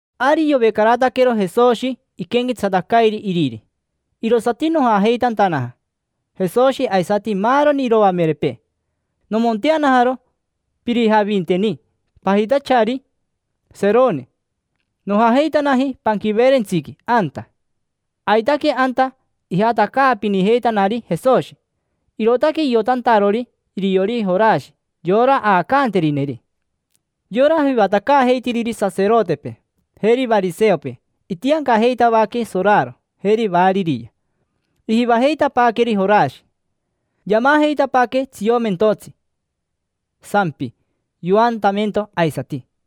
Ari yovecarataquero Jesoshi iquenquetsatacairi iriri, irosati nojajeitantanaja: Jesoshi, aisati maaroni iroamerepee. Nomonteanajaro pirijavinteni pajitachari Seroni. Nojajeitanaji panquiveerentsiqui anta. Aitaque anta ijatacaapinijeitanari Jesoshi, irootaque iotantarori iriori Jorashi, yora aacanterineri. Yora jivatacaajeitiriri saserotepee, jeri variseopee itiancajeitavaque soraro, jeri variria. Ijivajeitapaaqueri Jorashi. Yamajeitapaaque tsiomentotsi, sampi, yoantamento aisati;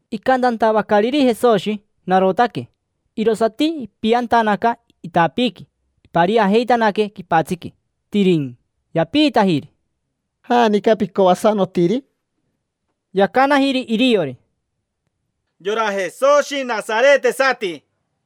Icantantavacariri Jesoshi: “Narotaque”, irosati ipiantanaca itapiiqui. Ipariajeitanaque quipatsiqui, tiriquicn. Yapiitajiri: —¿Janica picoasanotiri? Yacanajiri iriori: —Yora Jesoshi nasaretisati.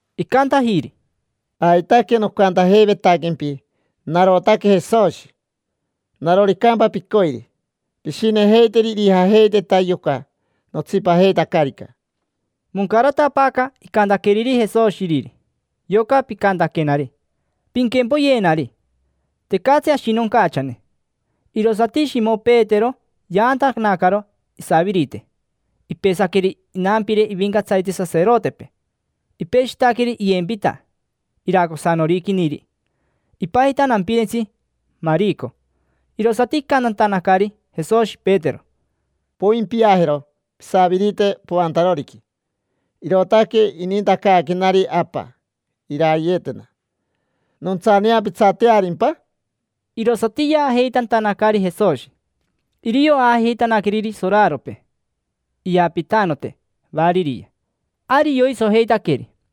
Icantajiri: —Aitaque nocantajeivetaquempi: “Narotaque Jesoshi”. Naroricampa picoiri, pishinejeiteri irijajeiteta yoca notsipajeitacarica. Moncaratapaaca icantaqueriri Jesoshi Iriri: “Yoca picantaquenari: ‘Pinquempoyenari’, tecatsi ashinoncachane”. Irosati Shimo Petero yaantanacaro isavirite. Ipesaqueri inampire ivincatsarite saserotepee: ipeshitaqueri iyempita iracosanoriquiniri. Ipajita nampirentsi Marico. Irosati icantantanacari Jesoshi Petero: —Poimpiajero pisavirite poantaroriqui. Irootaque inintacaaquenari Apa irayeetena. ¿Nontsaneapitsatearimpa? Irosati yaajeitantanacari Jesoshi. Irio aajeitanaqueriri soraropee, iyapitanote, variria. Ari yoisojeitaqueri.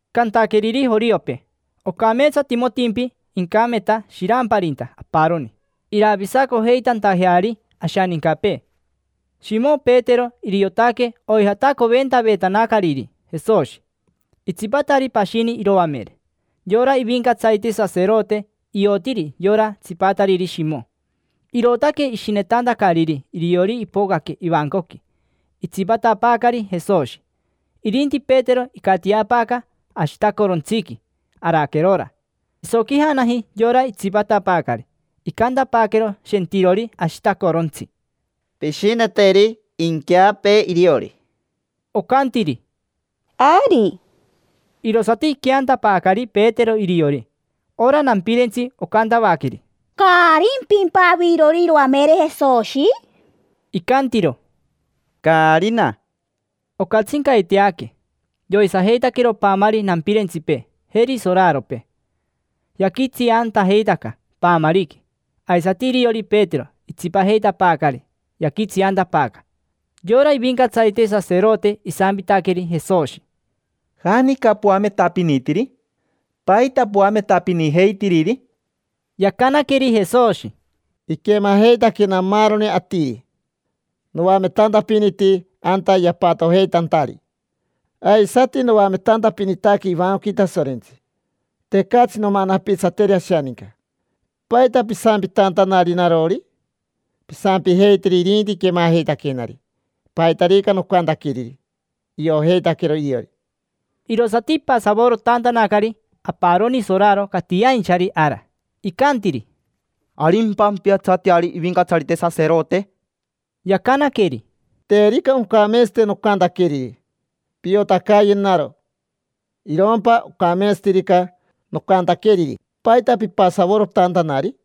cantaqueriri joriopee: “Ocameetsatimotimpi incameta shiramparinta aparoni, iravisacojeitantajeari ashanincapee”. Shimo Petero iriotaque oijatacoventavetanacariri Jesoshi, itsipatari pashini iroamere. Yora ivincatsarite saserote iotiri yora tsipatariri Shimo, irootaque ishinetantacariri iriori ipocaque ivancoqui, itsipatapaacari Jesoshi. Irinti Petero icatiapaaca ashitacorontsiqui araquerora. Isoquijanaji yora itsipatapaacari, icantapaaquero shentirori ashitacorontsi: —Pishineteri inqueapee iriori. Ocantiri: —Ari. Irosati iqueantapaacari Petero iriori. Ora nampirentsi ocantavaqueri: —¿Caarimpimpa avirori iroamere Jesoshi? Icantiro: —Caarina. Ocatsincaiteaque. Yoisajeitaquero paamari nampirentsipee, jeri soraropee. Yaquitsiantajeitaca paamariqui. Aisati iriori Petero itsipajeitapaacari yaquitsiantapaaca. Yora ivincatsarite saserote isampitaqueri Jesoshi: —¿Janica poametapinitiri? ¿Paita poametapinijeitiriri? Yacanaqueri Jesoshi: —Iquemajeitaquena maaroni atiri noametantiri. Noametantapiniti anta yapatojeitantari. Aisati noametapinitantaque ivancoqui Tasorentsi. Tecatsi nomanapitsateri ashaninca. ¿Paita pisampitantanari narori? Pisampijeiteri irinti quemajeitaquenari paitarica nocantaqueriri. Iojeitaquero iriori. Irosati ipasavorotantanacari aparoni soraro catiainchari ara. Icantiri: —¿Arimpa ampiatsateari ivincatsarite saserote? Yacanaqueri: —Terica oncameetsate nocantaqueriri, piotacayenaro. Irompa ocameetsatirica nocantaqueriri, ¿paita pipasavorotantanari?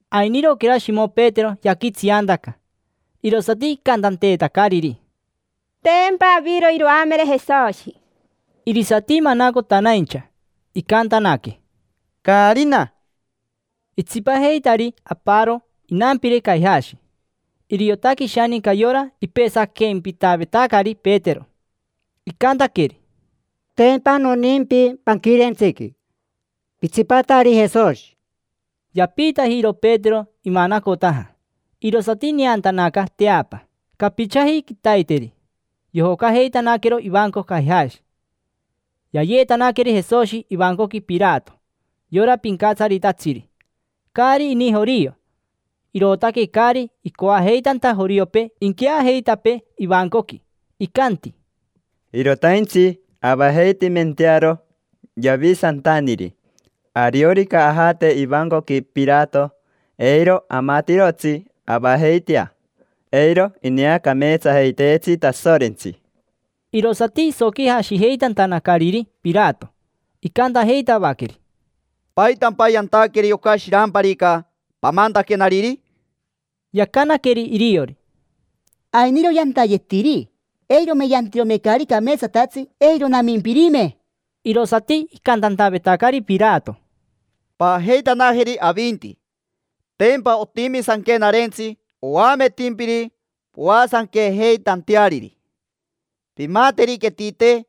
Ainiroquera Shimo Petero yaquitsiantaca. Irosati icantanteetacariri: —Tempa aviro iroamere Jesoshi. Irisati manacotanaincha, icantanaque: —Caarina. Itsipajeitari aparo inampire Caijashi. Iriotaque ishaninca yora ipesaquempitavetacari Petero. Icantaqueri: —Tempa noniimpi panquirentsiqui, pitsipatari Jesoshi. Yapiitajiro Petero imanacotaja. Irosati ineantanaca teapa. Capichaji quitaiteri yojocajeitanaquero ivanco Caijashi. Yayeetanaqueri Jesoshi ivancoqui Pirato, yora pincatsaritatsiri. Caari ini jorio, irootaque caari icoajeitanta joriopee inqueajeitapee ivancoqui. Icanti: —Irotaintsi avajeitimentearo Yavisantaniri. Ariorica ajate ivancoqui Pirato, eiro amatirotsi avajeitea, eiro ineacameetsajeiteetsi Tasorentsi. Irosati isoquijashijeitantanacariri Pirato. Icantajeitavaqueri: —¿Paitampa yantaqueri yoca shiramparica pamantaquenariri? Yacanaqueri iriori: —Ainiro yantayetiri. Eirome yantirome caari cameetsatatsi, eiro namimpirime. Irosati icantantavetacari Pirato: —Paajeitanajeri avinti. Tempa otimi sanquenarentsi oametimpiri poasanquejeitanteariri. Pimamateriquetite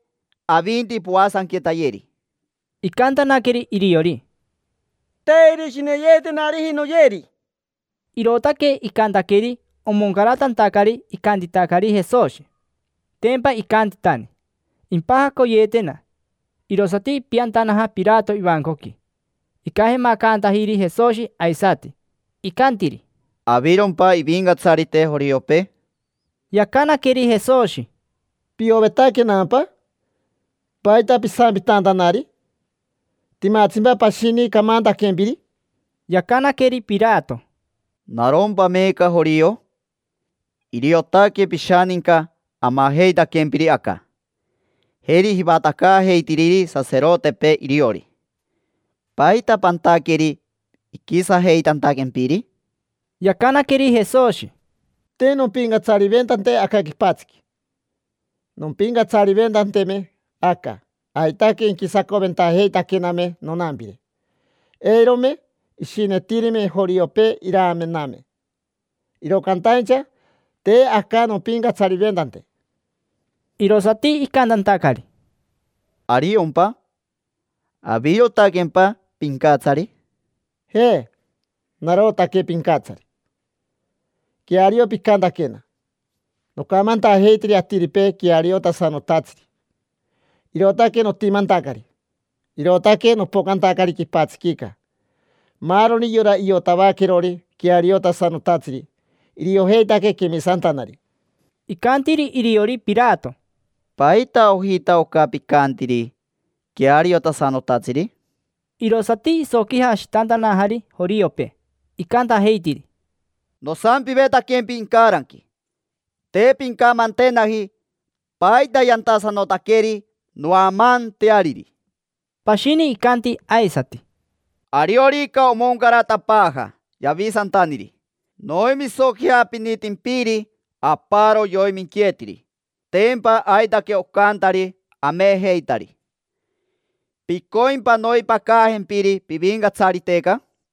avinti poasanquetayeri. Icantanaqueri iriori: —Te irishineyeetenariji noyeri. Irootaque icantaqueri omoncaratantacari icantitacari Jesoshi. Tempa icantitani: “Impajacoyeetena”. Irosati ipiantanaja Pirato ivancoqui. Icajemacantajiri Jesoshi aisati. Icantiri: —¿Avirompa ivincatsarite joriopee? Yacanaqueri Jesoshi: —¿Piovetaquenampa? ¿Paita pisampitantanari? ¿Timatsimpa pashini camantaquempiri? Yacanaqueri Pirato: —¿Narompa meeca jorio? Iriotaque pishaninca amajeitaquempiri aca, jeri jivatacaajeitiriri saserotepee iriori. ¿Paita pantaqueri iquisajeitantaquempiri? Yacanaqueri Jesoshi: —Te nompincatsariventante aca quipatsiqui. Nompincatsariventanteme aca, aitaque inquisacoventajeitaquename nonampire. Eirome ishinetirime joriopee iramename. Iro cantaincha te aca nompincatsariventante. Irosati icantantacari: —¿Ariompa? ¿Avirotaquempa pincatsari? —Je, narotaque Pincatsari. Queario picantaquena. Nocamantajeitiri atiripee queariotasanotatsiri. Irootaque notimantacari, irootaque nopocantacari quipatsiquica. Maaroni yora iotavaquerori queariotasanotatsiri, iriojeitaque quemisantanari. Icantiri iriori Pirato: —¿Paita ojita oca picantiri: “Queariotasanotatsiri”? Irosati isoquijashitantanajari joriopee, icantajeitiri: —Nosampivetaquempi incaranqui, te pincamantenaji paita yantasanotaqueri noamaanteariri. Pashini icanti aisati: —Ariorica omoncaratapaaja Yavisantaniri, noimisoquijapinitimpiri aparo yoiminqueetiri. Tempa aitaque ocantari amejeitari. ¿Picoimpa noimpacajempiri pivincatsariteca?